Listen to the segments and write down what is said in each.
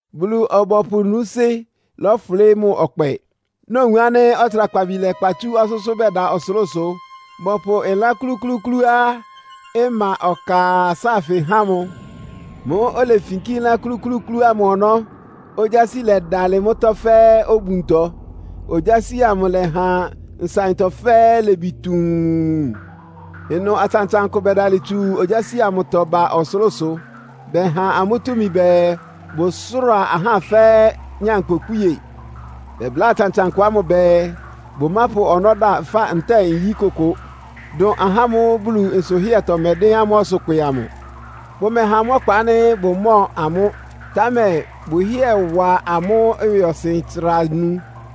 Bulu-ɔbɔpʋ núúsɩ́ lɔ́fʋlɩ́ mʋ ɔkpɛ. Nowun ánɩ́ ɔtsrakpabi lɛ́kpa tsú ɔsʋ́sʋ́ bɛda ɔsʋlʋ́sʋ, bɔpʋ ɩlán klúklúúklúá ɩma ɔka sáafɩ há mʋ. Mʋ́ʋ́ olefinkí ɩlán klúklúúklú ámʋ ɔnɔ́, ogyási lɛdalɩ mʋ́tɔ́ fɛ́ obuntɔ. Ogyási amʋ ɩlɛha nsaɩntɔ fɛ́ɛ́ ilebi tuun. Ɩnʋ atsantsankʋ bɛdalɩ tsu ogyási amʋtɔ ba ɔsʋlʋ́sʋ. Bɛha amʋ́ túmi bɛɛ bʋsʋ́ra ahá fɛ́ nyankpʋkpíe. Bɛbláa atsantsankʋ ámʋ bɛɛ, bʋmápʋ ɔnɔ́ da ɩfá ntɛ́ɛ nyí kʋkʋ, dʋn ahá ámʋ́ʋ́ Bulu nsʋhɩ́ɛtɔ mɛdɩ́n amʋ́ ɔsʋkpɩ amʋ. Bʋmɛha amʋ́ ɔkpa ánɩ́ bʋmɔ́ɔ amʋ́, támɛ bʋhɩ́ɛ wa amʋ́ ɩwɩɔsɩn tsra anu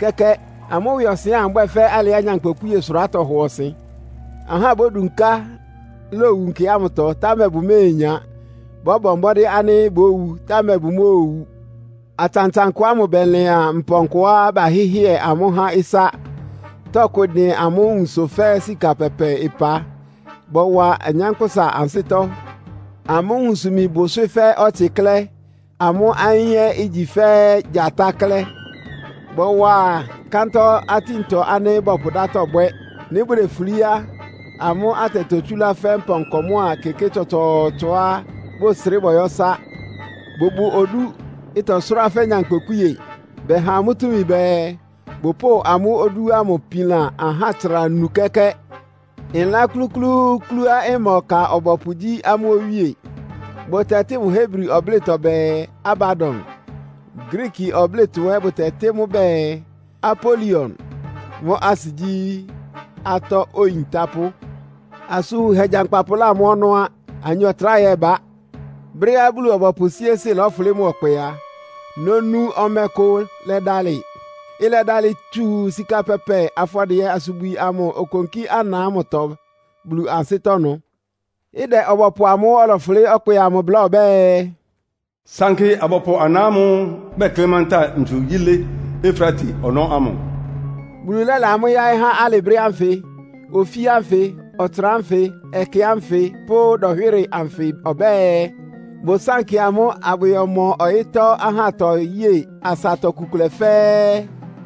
kɛ́kɛ́. Amʋ́ ɩwɩɔsɩn ámʋ ɩbwɛ́ fɛ́ alɩá nyankpʋkpíe-sʋrá tɔhɔ ɔsɩn. Ahá bódunká lowu nkɛ ámʋtɔ, támɛ bʋméenya. Bɔ́bɔ mbɔ́dɩ́ ánɩ́ bówu, támɛ bʋmóowu. Atsantsankʋ ámʋ bɛlɩan mpɔnkɔá bahɩ́hɩɛ amʋ́ há ɩsá, tɔkʋ ɩdɩn amʋ́ nwunsʋ fɛ́ sika pɛpɛ ɩpa. Bɔwa anyánkpʋ́sa ansɩ́tɔ́. Amʋ́ nwunsʋ-imi bʋ ɩswɩ́ fɛ́ ɔtsɩ klɛ́. Amʋ́ ayín ɛ́ igyi fɛ́ gyatá klɛ́. Bɔwa kántɔ́ atíntɔ ánɩ́ bɔpʋ dátɔ bwɛ́. Nɩ́ bʋdefulí á, amʋ́ atɛ totsúlá fɛ́ mpɔnkɔ mʋ́a keké tsɔtsɔɔtsɔá bʋsrɩ́ bɔyɔ́ ɩsá. Bʋbʋ odú, ɩtɔsʋ́rá fɛ́ nyankpʋkpíe. Bɛha amʋ́ túmi bɛɛ, bʋpʋ́ʋ amʋ́ odú ámʋ pilan ahá tsra anu kɛ́kɛ́. Ɩlán klúklúúklúá ɩma ɔka ɔbɔpʋ gyí amʋ́ owíe. Bʋtɛtɩ́ mʋ Hebrifɔ ɔblɩ́tɔ bɛɛ, Abadon. Griiki ɔblɩ́tɔ ɛ́ bʋtɛtɩ́ mʋ bɛɛ, Apolion. Mʋ́ asɩ gyí, “Atɔ́ Oyintápʋ́.” Asʋn wunhɛ gyankpapʋ lámɔ́ ɔnɔ́ á. Anyɔ tráhɛ ɛ́ ɩbá. Brɛ́á Bulu-ɔbɔpʋ síésɩ́ lɔ́fʋlɩ́ mʋ ɔkpɛ a, nonu ɔmɛ kʋ lɛdalɩ. Ɩlɛdalɩ tsu sika pɛpɛ afɔdɩɛ-asubwi ámʋ okonkí ana ámʋtɔ Bulu ansɩ́tɔ́ ɩnʋ. Ɩdɛ ɔbɔpʋ amʋ́ʋ́ ɔlɔfʋlɩ́ ɔkpɛ amʋ bláa ɔbɛ́ɛ, “Sankɩ abɔpʋ ana ámʋ́ʋ́ bɛklɩ́ mántá ntsu yílé Efrate ɔnɔ́ ámʋ.” Bulu lɛ́la amʋ́ yáɩ́ há alɩ brɛ́ ánfɩ, ofí ánfɩ, ɔtsra ánfɩ, ɛkɛ ánfɩ pʋ́ dɔnhwɩ́rɩ anfɩ ɔbɛ́ɛ, bʋsánkɩ amʋ́ abʋyɔmɔ ɔyɩ́tɔ́ ahátɔ yée asatɔ iku kʋlɛ fɛ́ɛ́.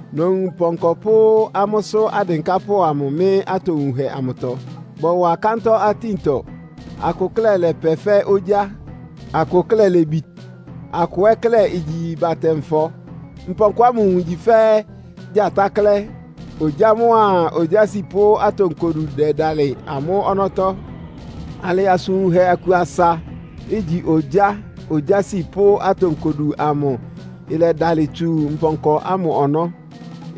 Nowun mpɔnkɔ pʋ́ amʋ́sʋ́ adɩnkápʋ́ mɩ́ atowunhɛ amʋtɔ, bɔwa kántɔ́ atíntɔ. Akʋ klɛ́ lɛpɛ fɛ́ ogyá, akʋ klɛ́ lebi, akʋ ɛ́ klɛ́ igyi batɛ-nfɔ. Mpɔnkɔ ámʋ nwun igyi fɛ́ gyatá klɛ́, ogyá mʋ́a ogyási pʋ́ atonkodu dɛdalɩ amʋ́ ɔnɔ́tɔ́. Alɩ asʋn wunhɛ aku asa, igyi ogyá, ogyási pʋ́ atonkodu amʋ ɩlɛdalɩ tsu mpɔnkɔ ámʋ ɔnɔ́,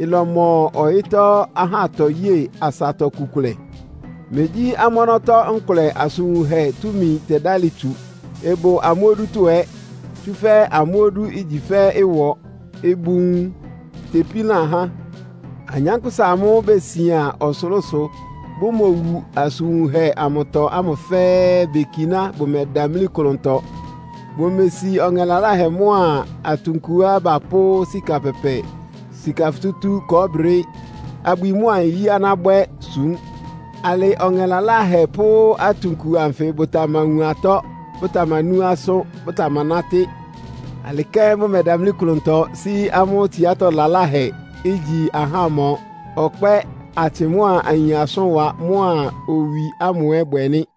ɩlɔmɔ ɔyɩ́tɔ́ ahátɔ yée asatɔ iku kʋlɛ. Megyí amʋ́ ɔnɔ́tɔ́ nkʋlɛ asʋn wunhɛ túmi tɛdálɩ tsu. Ɩbʋ amʋ́ odútɔ́ ɛ́, tsúfɛ́ amʋ́ odú igyi fɛ́ ɩwɔ, ɩbʋ nwun, itepílan ahá. Anyánkpʋ́sa amʋ́ʋ́ besian ɔsʋlʋ́sʋ, bʋmowu asʋn wunhɛ amʋtɔ ámʋ fɛ́ɛ́ bekiná bʋmɛdamlí klʋntɔ. Bʋmesi ɔŋɛ laláhɛ mʋ́a atunkuá bapʋ́ sika pɛpɛ, sika futútú, kɔɔ́brɩ, abwi mʋ́a nyí aná bwɛ́ súm. Alɩ ɔŋɛ laláhɛ pʋ́ atunku anfɩ bʋtamawun atɔ́, bʋtamanú asʋ́n, bʋtamanátɩ́. Alɩ kɛ́n bʋmɛdamlí klʋntɔ sí amʋ́ tsiátɔ́ laláhɛ; ígyi ahámɔ, ɔkpɛ́, atsɩ mʋ́a ayin asʋ́nwa mʋ́a owi ámʋ ɛ́ bwɛ nɩ́.